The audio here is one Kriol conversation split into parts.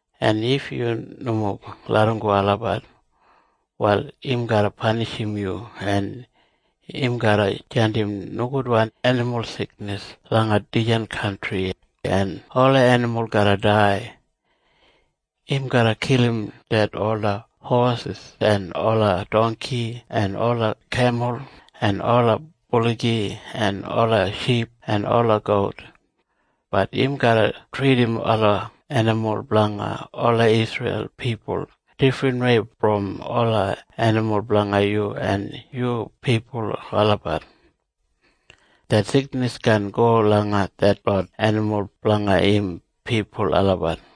En if yu nomo larramgo olabat, wal im garra panishim yu, en im garra jandim nogudwan enimul siknis langa dijan kantri, en ola enimul garra dai. Im garra kilim ded ola hosis en ola dongki en ola kemul en ola buligi en ola ship en ola gout. Bat im garra tridim ola enimul blanga ola Isreil pipul difrinwei brom ola enimul blanga yu en yu pipul olabat. Det siknis kaan go langa detlot enimul blanga im pipul olabat.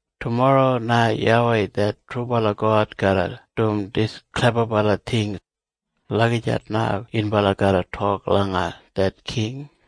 Tumorro na YAWEI det trubala God garra dum dis klebabala ting.’ Lagijat na yunbala garra tok langa det king.”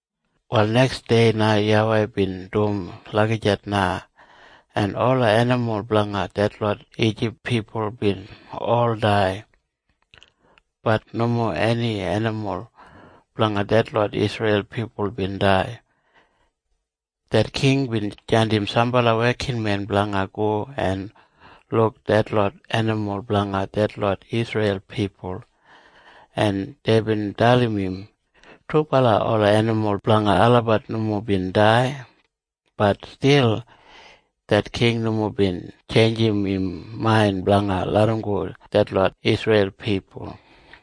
Wal neksdei na YAWEI bin dum lagijat na, en ola enimul blanga detlot Ijip pipul bin ol dai. Bat nomo eni enimul blanga detlot Isreil pipul bin dai. Det king bin jandim sambala wekinmen blanga go en luk detlot enimul blanga detlot Isreil pipul, en deibin dalim im trubala ola enimul blanga olabat nomo bin dai. Bat stil det king nomo bin tjeinjim im main blanga larramgo detlot Isreil pipul.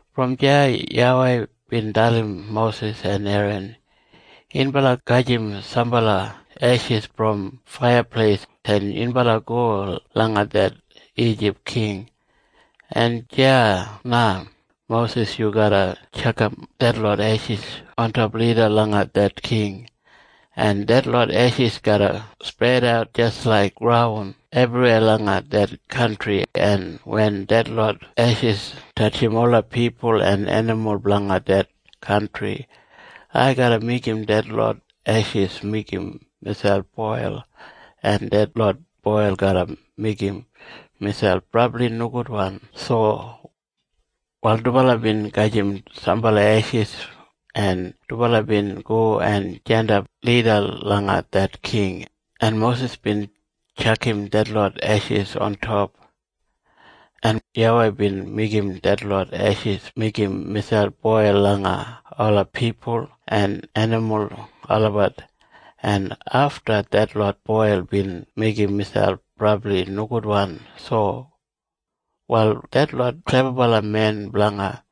Brom deya YAWEI bin dalim Mosis en Eran, “Yunbala gajim sambala eshis brom faiyapleis, en yunbala go langa det Ijip king, en deya na, Mosis, yu garra tjakam detlot eshis ontop lida langa det king, en detlot eshis garra spredat jis laik graun ebriweya langa det kantri, en wen detlot eshis tatjim ola pipul en enimul blanga det kantri, ai garra meigim detlot eshis meigim miselp boil, en detlot boil garra meigim miselp brabli nogudwan sowa.” Wal dubala bin gajim sambala eshis, en dubala bin go en jandap lida langa det king, en Mosis bin tjakam detlot eshis ontop, en YAWEI bin meigim detlot eshis meigim miselp boil langa ola pipul en enimul olabat, en afta detlot boil bin meigim miselp brabli nogudwan sowa. Wal detlot klebabalamen blanga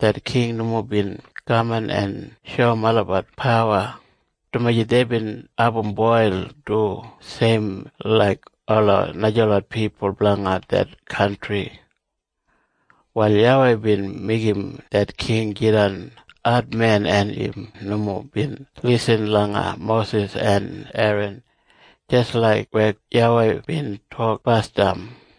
det king nomo bin kaman en shoum olabat pawa, dumaji deibin abum boil du seimwei laik ola najalot pipul blanga det kantri. Wal YAWEI bin meigim det king jidan admen, en im nomo bin lisin langa Mosis en Eran, jis laik weya YAWEI bin tok basdam.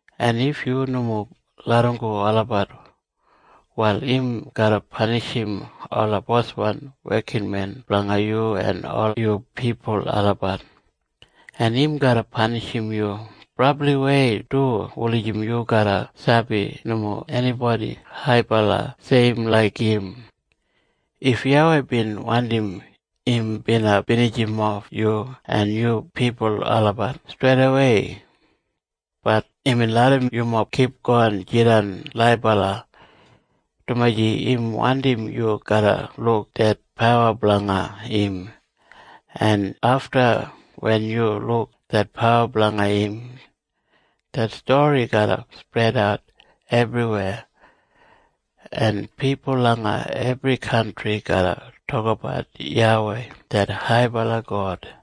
En if yu nomo larramgo olabat, wal im garra panishim ola boswan wekinmen blanga yu en ol yu pipul olabat, en im garra panishim yu brabliwei du wulijim yu garra sabi nomo enibodi haibala seim laik im. If YAWEI bin wandim, im bina binijimof yu en yu pipul olabat streidawei. Bat imbin larram yumob kipgon jidan laibala, dumaji im wandim yu garra luk det pawa blanga im, en afta wen yu luk det pawa blanga im, det stori garra spredat ebriweya, en pipul langa ebri kantri garra tokabat YAWEI det haibala God.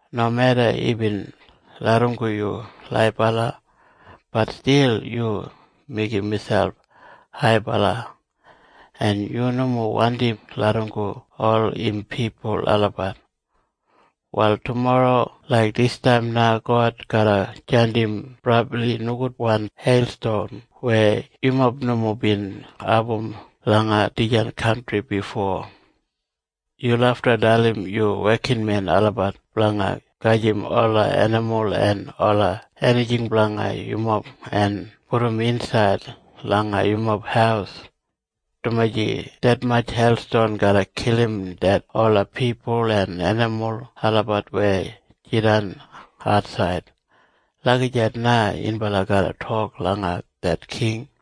Nomeda imbin larramgo yu laibala, bat stil yu meigim miselp haibala, en yu nomo wandi larramgo ol im pipul olabat. Wal tumorro laik distaim na God garra jandim brabli nogudwan heilstom weya yumob nomo bin abum langa dijan kantri bifo. Yu lafta dalim yu wekinmen olabat blanga gajim ola enimul en ola enijing blanga yumob en pudum insaid langa yumob haus, dumaji detmatj heilston garra kilim ded ola pipul en enimul olabat weya jidan atsaid.’ Lagijat na yunbala garra tok langa det king.”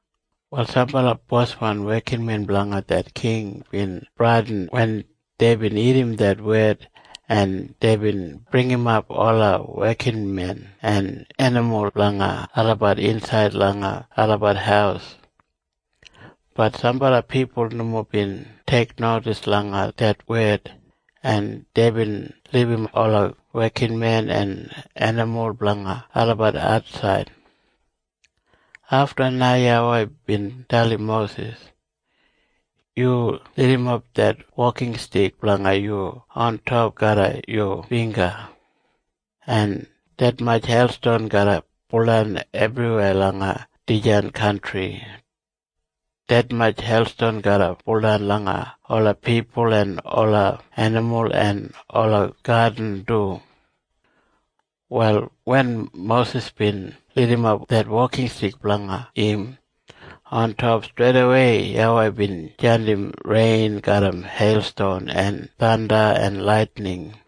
Wal sambala boswan wekinmen blanga det king bin bradin wen deibin irrim det wed, en deibin bringimap ola wekinmen en enimul blanga olabat insaid langa olabat haus. Bat sambala pipul nomo bin teiknodis langa det wed, en deibin libum ola wekinmen en enimul blanga olabat atsaid. Afta na YAWEI bin dalim Mosis, “Yu lidimap det wokinstik blanga yu ontop garram yu bingga, en detmatj heilston garra buldan ebriweya langa dijan kantri. Detmatj heilston garra buldan langa ola pipul en ola enimul en ola gadin du.” Wal wen Mosis bin lidimap det wokinstik blanga im ontop, streidawei YAWEI bin jandim rein garram heilston en thanda en laitining.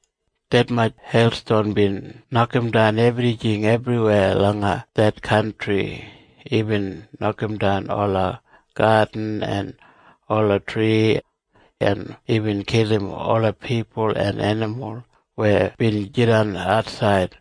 Detmatj heilston bin nokamdan ebrijing ebriweya langa det kantri. Imbin nokamdan ola gadin en ola tri, en imbin kilim ola pipul en enimul weya bin jidan atsaid.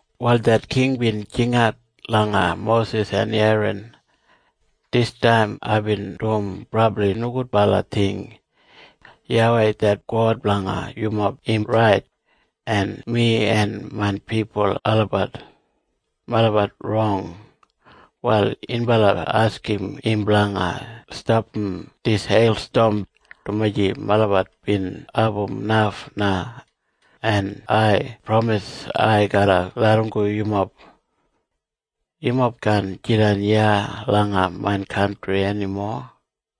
Wal det king bin jingat langa Mosis en Eran, “Distaim aibin dum brabli nogudbala ting. YAWEI det God blanga yumob im rait, en mi en main pipul olabat melabat rong. Wal yunbala askim im blanga stapam dis heilstom, dumaji melabat bin abum naf na, en ai pramis ai garra larramgo yumob. Yumob kaan jidan iya langa main kantri enimo.”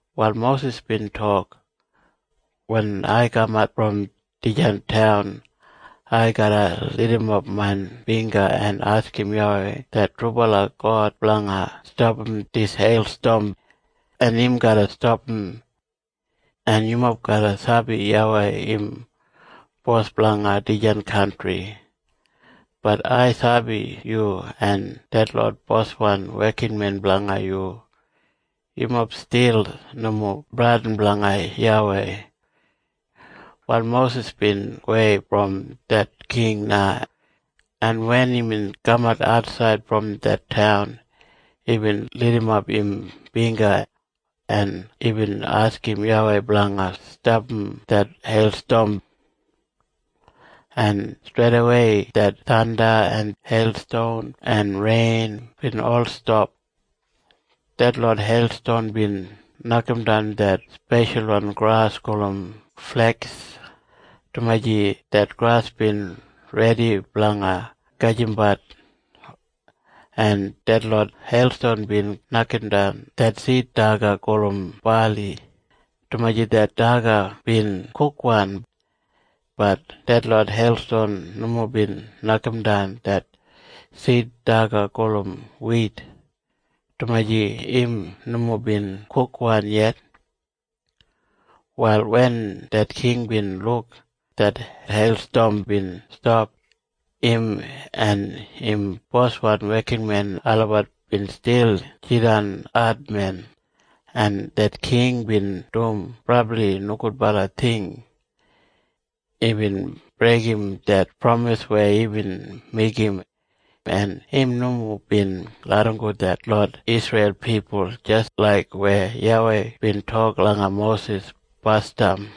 Wal Mosis bin tok, “Wen ai kamat brom dijan taun, ai garra lidimap main bingga en askim YAWEI det trubala God blanga stapam dis heilstom, en im garra stapam. En yumob garra sabi YAWEI im bos blanga dijan kantri. Bat ai sabi yu en detlot boswan wekinmen blanga yu. Yumob stil nomo bradin blanga YAWEI.” Wal Mosis bin gowei brom det king na, en wen imbin kamat atsaid brom det taun, imbin lidimap im bingga, en imbin askim YAWEI blanga stapam det heilstom, en streidawei det thanda en heilston en rein bin ol stap. Detlot heilston bin nokamdan det speshalwan gras gulum fleks, dumaji det gras bin redi blanga gajimbat, en detlot heilston bin nokamdan det sid daga gulum bali, dumaji det daga bin kukwan. Bat detlot heilston nomo bin nokamdan det sid daga gulum wit, dumaji im nomo bin kukwan yet. Wal wen det king bin luk det heilstom bin stap, im en im boswan wekinmen olabat bin stil jidan admen, en det king bin dum brabli nogudbala ting. Imbin breigim det pramis weya imbin meigim, en im nomo bin larramgo detlot Isreil pipul jis laik weya YAWEI bin tok langa Mosis basdam.